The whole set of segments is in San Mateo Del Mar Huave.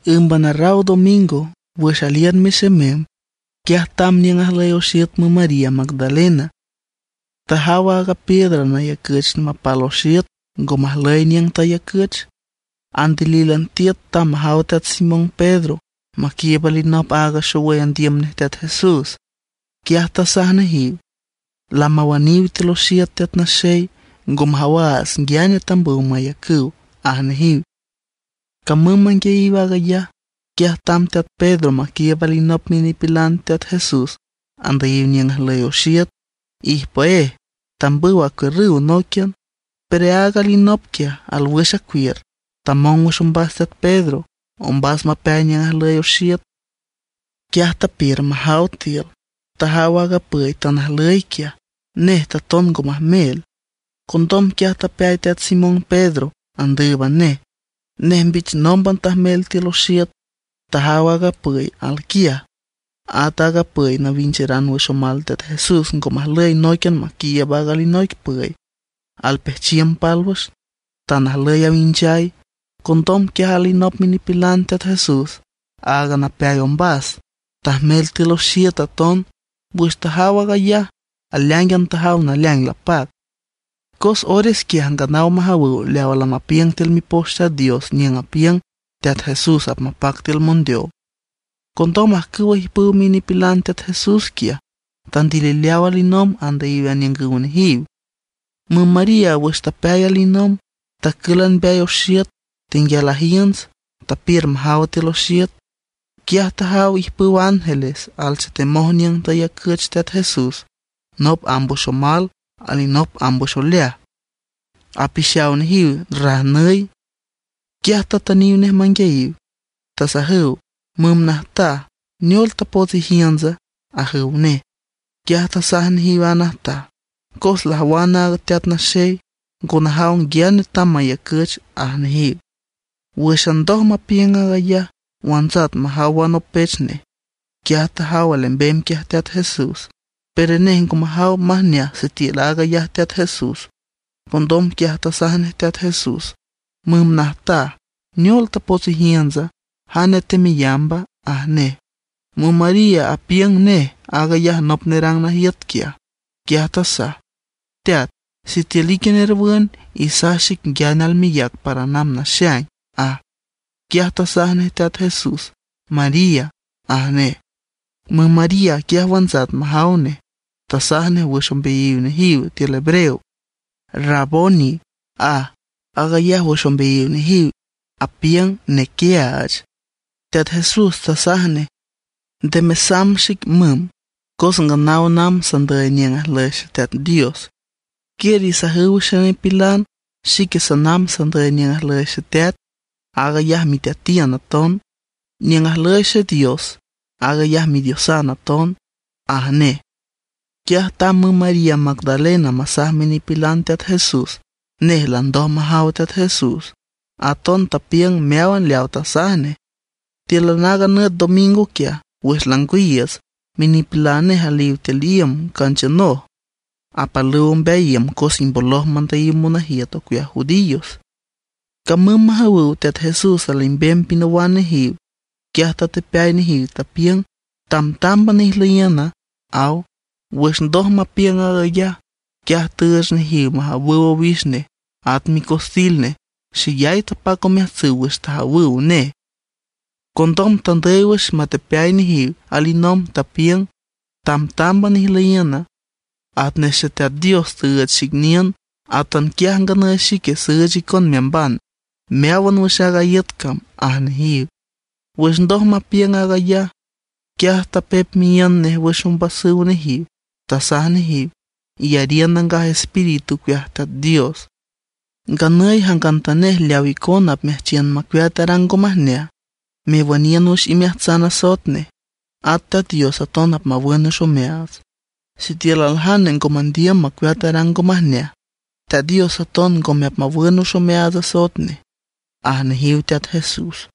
Ǘmban arraw domingo wüx aliün mexemem, quiaj tamb niüng ajlüy oxiüt müm María Magdalena, tajaw aaga piedra nayacüch mapal oxiüt ngo majlüy niüng tayacüch. Andilílan tiüt tamb majaw teat Simón Pedro maquiiüb alinop aaga xowüy andiüm nej Teat Jesús. Quiaj tasaj nejiw: ―Lamawüniw tiül oxiüt Teat Naxey, ngo majawaats nguiane tambüw mayacüw ―aj nejiw. Camüm manguiayiw aag ayaj, quiaj tamb teat Pedro maquiiüb alinop minipilan Teat Jesús andüyiw niüng ajlüy oxiüt. Ijpüéj tambüw acuiürrüw nóiquian, pero aaga alinop quiaj alwüx acuiür, tamong wüx ombas teat Pedro, ombas mapeay niüng ajlüy oxiüt. Quiaj tapiür majaw tiül. Tajaw aaga püy tan ajlüy quiaj; nej taton ngo majmel. Condom quiaj tapeay teat Simón Pedro andǘüban nej. Nej mbich nómban tajmel tiül oxiüt, tajaw aaga püy alquiaj. At aaga püy nawincheran wüx omal Teat Jesús ngo majlüy nóiquian maquiiüb aaga alinoic püy; alpejchiüm pálwüx, tan ajlüy awinchay. Condom quiaj alinop minipilan Teat Jesús, aaga napeay ombas, tajmel tiül oxiüt aton. Wüx tajaw aag ayaj, aleáingan tajaw naleaing lapac. Cos ores quiaj nganaw majawüw leawa lamapiüng tiül Mipoch Teat Dios niüng apiüng Teat Jesús apmapac tiül mondeow. Condom ajcüwa ijpüw minipilan Teat Jesús quiaj, tandilileaw alinomb andüyiw aniüngüw nejiw. Müm María wüx tapeay alinomb, tacǘlan mbeay oxiüt, tenguial ajiünts, tapiür majaw tiül oxiüt. Quiaj tajaw ijpüw ángeles alchetemoj niüng tayacüch Teat Jesús; nop amb wüx omal, alinop amb wüx oleaj, apixaw nejiw rajnüy. Quiaj tatüniw nej manguiayiw, tasajüw: ―Müm najtaj, ¿Neol tapots ijiüntsa? ―ajüw nej. Quiaj tasaj nejiw aaga najtaj: ―Cos lajwan aaga Teat Naxey, ngo najaw nguiane tamb mayacüch ―aj nejiw. Wǘxan ndoj mapiüng aag ayaj, wantsat majaw wanopech nej. Quiaj majaw alembem quiaj Teat Jesús, pero nej ngo majaw majneaj sitiül aag ayaj Teat Jesús. Condom quiaj tasaj nej Teat Jesús: ―Müm najtaj ¿neol tapots ijiüntsa, jane teameyamba? ―aj nej. Müm María apiüng nej aag ayaj nop nerang najiüt quiaj. Quiaj tasaj: ―Teat, sitiül ique nerwün, isaj xic nguiane almeyac para namb naxaing ―aj. Quiaj tasaj nej Teat Jesús: ―¡María! ―aj nej. Müm María quiaj wantsat majaw nej, tasaj nej wüx ombeayiw nejiw, tiül hebreo: ―¡Raboni! ―aj. Aag ayaj wüx ombeayiw nejiw apiüng Nequiaach. Teat Jesús tasaj nej: ―Nde mesamb xic müm, cos nganaw namb sandüy niüng ajlüy Xeteat Dios. Quiür isajüw xenipilan, xique sanamb sandüy niüng ajlüy Xeteat, aag ayaj Miteatiün aton; niüng ajlüy Xedios, aag ayaj Midiosan aton ―aj nej. Quiaj tamb müm María Magdalena masaj minipilan Teat Jesús nej landoj majaw Teat Jesús. Aton tapiüng meáwan leawa tasaj nej. Tíülan aaga nüt domingo quiaj, wüx langwiiüts, minipilan nej aliw tiül iüm canchiünoj; apalüw ombeay iüm cos imboloj mandüyiw monajiüt ocueaj judíos. Camüm majawüw Teat Jesús alembem pinawan nejiw. Quiaj tatepeay nejiw, tapiüng: ―Tamtámban ijlüyiüna ―aw. Wüx ndoj mapiüng aag ayaj, quiaj tüüch nejiw majawüw owix nej at micostil nej. Xeyay tapac omeajtsüw wüx tajawüw nej. Condom tandüy wüx matepeay nejiw alinomb. Tapiüng: ―Tamtámban ijlüyiün. Atnej Xeteat Dios tüüch xic niün, atanquiaj nganüy xique süüch icon meamban meáwan wüx aaga iüt cam ―aj nejiw. Wüx ndoj mapiüng aag ayaj, quiaj tapep miíünd nej wüx ombasüw nejiw. Tasaj nejiw: ―Iyariün Nangaj Espíritu ocueaj Teat Dios. Nganüy jangantanej leaw icona apmeajchiün macueat arang ngo majneaj, mewüniün wüx imeajtsan asoet nej, at Teat Dios aton apmawün wüx omeaats. Sitiül aljane ngo mandiüm macueat arang ngo majneaj, Teat Dios aton ngome apmawün wüx omeaats asoet nej ―aj nejiw Teat Jesús.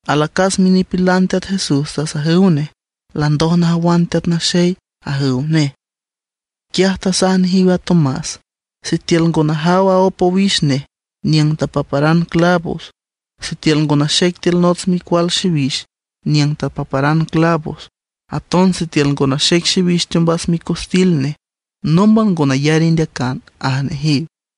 Alacas minipilan Teat Jesús tasajüw nej: ―¡Landoj najawan Teat Naxey! ―ajüw nej. Quiaj tasaj nejiw a Tomás: ―Sitiül ngo najaw aóp owix nej niüng tapaparan clavos, sitiül ngo naxec tiül nots micual xiwix niüng tapaparan clavos; aton sitiül ngo naxec xiwix teombas micostil nej, nómban ngo nayar indeacan ―aj nejiw.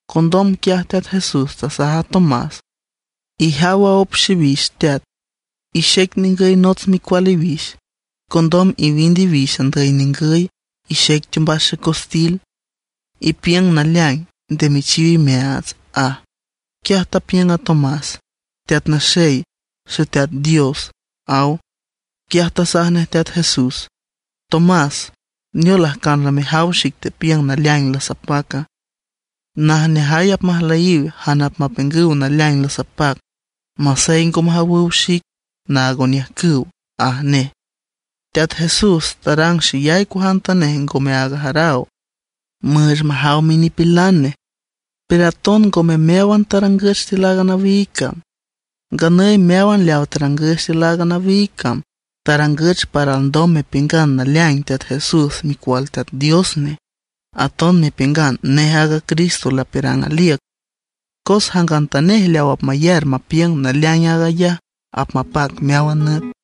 Condom quiaj Teat Jesús tasaj a Tomás: ―Ijaw aop xiwix teat, ixec ningüy nots micual iwix, condom iwind iwix andüy ningüy, ixec teombas xecostil. Ipiüng naleaing, nde mechiw imeaats ―aj. Quiaj tapiüng a Tomás: ―¡Teat Naxey, Xeteat Dios! ―aw. Quiaj tasaj nej Teat Jesús: ―Tomás ¿neol, ajcan lamejaw xic tepiüng naleaing lasapaca? Najneajay apmajlüyiw jane apmapiüngüw naleaing lasapac masey ngo majawüw xic naag oniüjcüw ―aj nej. Teat Jesús tarang xeyay cuajantanej ngome aag ajaraw, müüch majaw minipilan nej; pero aton ngome meáwan tarangüch tiül aaga nawiig cam. Nganüy meáwan leawa tarangüch tiül aaga nawiig cam, tarangüch para alndom mepiüngan naleaing Teat Jesús Micual Teat Dios nej; aton mepiüngan nej aaga Cristo lapiürang aliüc. Cos jangantanej leaw apmayar mapiüng naleaing aag ayaj, apmapac meáwan nüt.